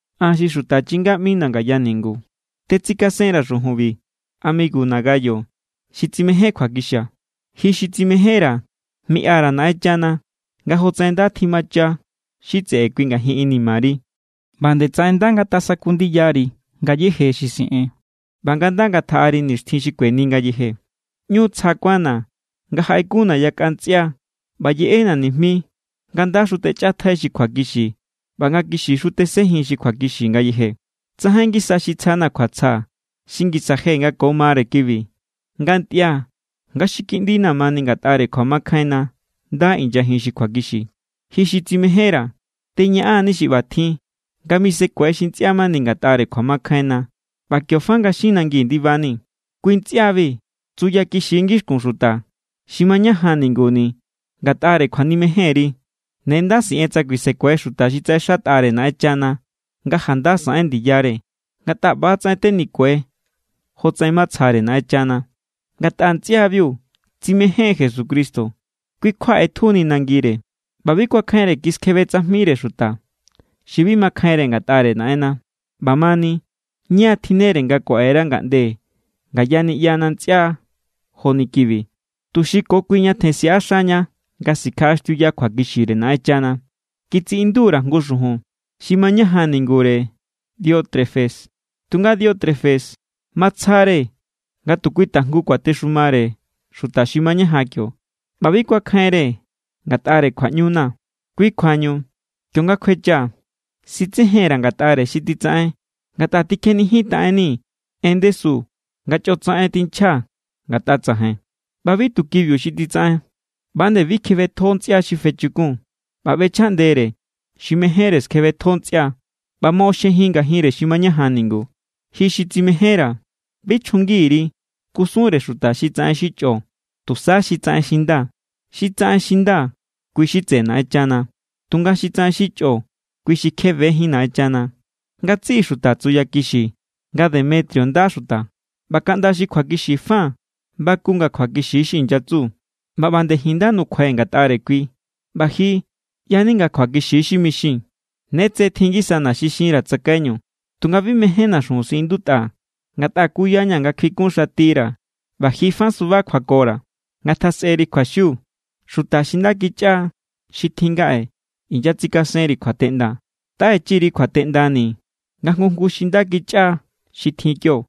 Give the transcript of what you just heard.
An, xi xuta chinga ꞌmina̱ ngaya ningu, tetsikasen_ra̱ xujunbi amiguna Gayo xi tsimején kjuakixia̱. Ji xi tsimejénra̱, miꞌa_ra̱ Naꞌenchana nga jotsaꞌen nda tjimacha xi tseꞌe kui ngajin inimari, ꞌba nde tsaꞌen nda ngatasaku ndiyari ngayéje xi siꞌen ꞌba nga nda ngatjaꞌari nixtjin xi kueni ngayeje. ꞌÑu tsja kuánna̱ nga jaꞌekunna̱ yakꞌa ntsꞌia ꞌba yeꞌena̱ nijmi nga ndaxu techꞌatjai xi kjuakixi ꞌba nga kixixu tesenjin xi kjuakixi ngayeje. Tsajain ngisa xi tsjana̱ kjuatsja xi ngisa je nga ko mare kibi, nga ntꞌia̱ nga xi kiꞌndina̱ mani ngatꞌare kjuamakjainna nda inyajin xi kjuakixi. Ji xi tsimejénra̱, teñaꞌan=ni xi ꞌbatjin nga misekue xi ntsꞌia mani ngatꞌare kjuamakjainna ꞌba kio fa nga xin nangi ndibani. Kui ntsꞌiabi tsuya kixi= ngixkun xuta xi mañajan ninguni̱ ngatꞌare kjuanimejenri. Ne nda siꞌen tsa kuisekue xuta xi tsaꞌexatꞌare Naꞌenchana nga janda saꞌen ndiyare, ngatꞌa ꞌba=tsaꞌen tenikue jotsaꞌen matsjare Naꞌenchana. Ngatꞌa ntsꞌiabiu tsimején= Jesucristo, kui= kjua ꞌetjuni nangire, ꞌba bi kuakjainre kiskjebe tsajmire xuta xi bi makjainre ngatꞌare Naꞌenna. ꞌBamani, ña= tjinnere nga kuaꞌera ngaꞌnde ngaya niꞌyana ntsꞌia joni kibi, tuxi ko kui ñatjen siꞌaxaña nga sikjaꞌaxtiuya kjuakixire Naꞌenchana. Kitsiꞌindu_ra̱ jngu xujun xi mañajan ningure Diótrefes. Tunga Diótrefes, matsja=re nga tu kui tajngu kuatexumare xuta xi mañajan kio ꞌba bi kuakjainre ngatꞌare kjuaꞌñuna̱. Kui kjuañu, kionga an kjuechaa̱, sitsejen_ra̱ ngatꞌare xi titsaꞌen ngatꞌa tikjenijintaꞌenni en ndesu nga chꞌotsaꞌen tinchja ngatꞌa tsajain. ꞌBa bi tu kibiu xi titsaꞌen. ꞌBa nde bi kjebetjo ntsꞌia xi fechukun ꞌba ꞌbechjaꞌndere xi mejénre skjebetjo ntsꞌia ꞌba moꞌoxjejin ngajinre xi mañajan ningu. Ji xi tsimejénra̱, bi chjungi_ri kusunre xuta xi tsaꞌen xi chꞌo, tusa xi tsaꞌen xi nda. Xi tsaꞌen xi nda, kui= xi tseꞌe Naꞌenchana. Tunga xi tsaꞌen xi chꞌo, kui xi kje bejín Naꞌenchana. Ngatsiꞌi xuta tsuyakixi nga Demetrio nda xuta. ꞌBa kaꞌnda xi kjuakixi fa baku nga kjuakixi= xi inyatsu. ꞌBa ꞌba nde ji̱n nda= nukjuai̱ ngatꞌare kui, ꞌba ji ꞌya=ni nga kjuakixi= xi mixii̱n. Ne tse tjin ngisana xi xinra̱ tsakaiñu, tunga bi mejénna̱ xujun siꞌindutꞌa, ngatꞌa kuya=ña̱ nga kjuikunxatira̱ ꞌba ji fa suba kjuakora̱. Ngatjasꞌeri kjuaxiu. Xuta xi nda kichꞌa xi tjin ngaꞌe inyatsikasenri kjuateꞌnda. Taꞌechi_ri kjuateꞌndani̱ nga jngu jngu xi nda kichꞌa xi tjin kio.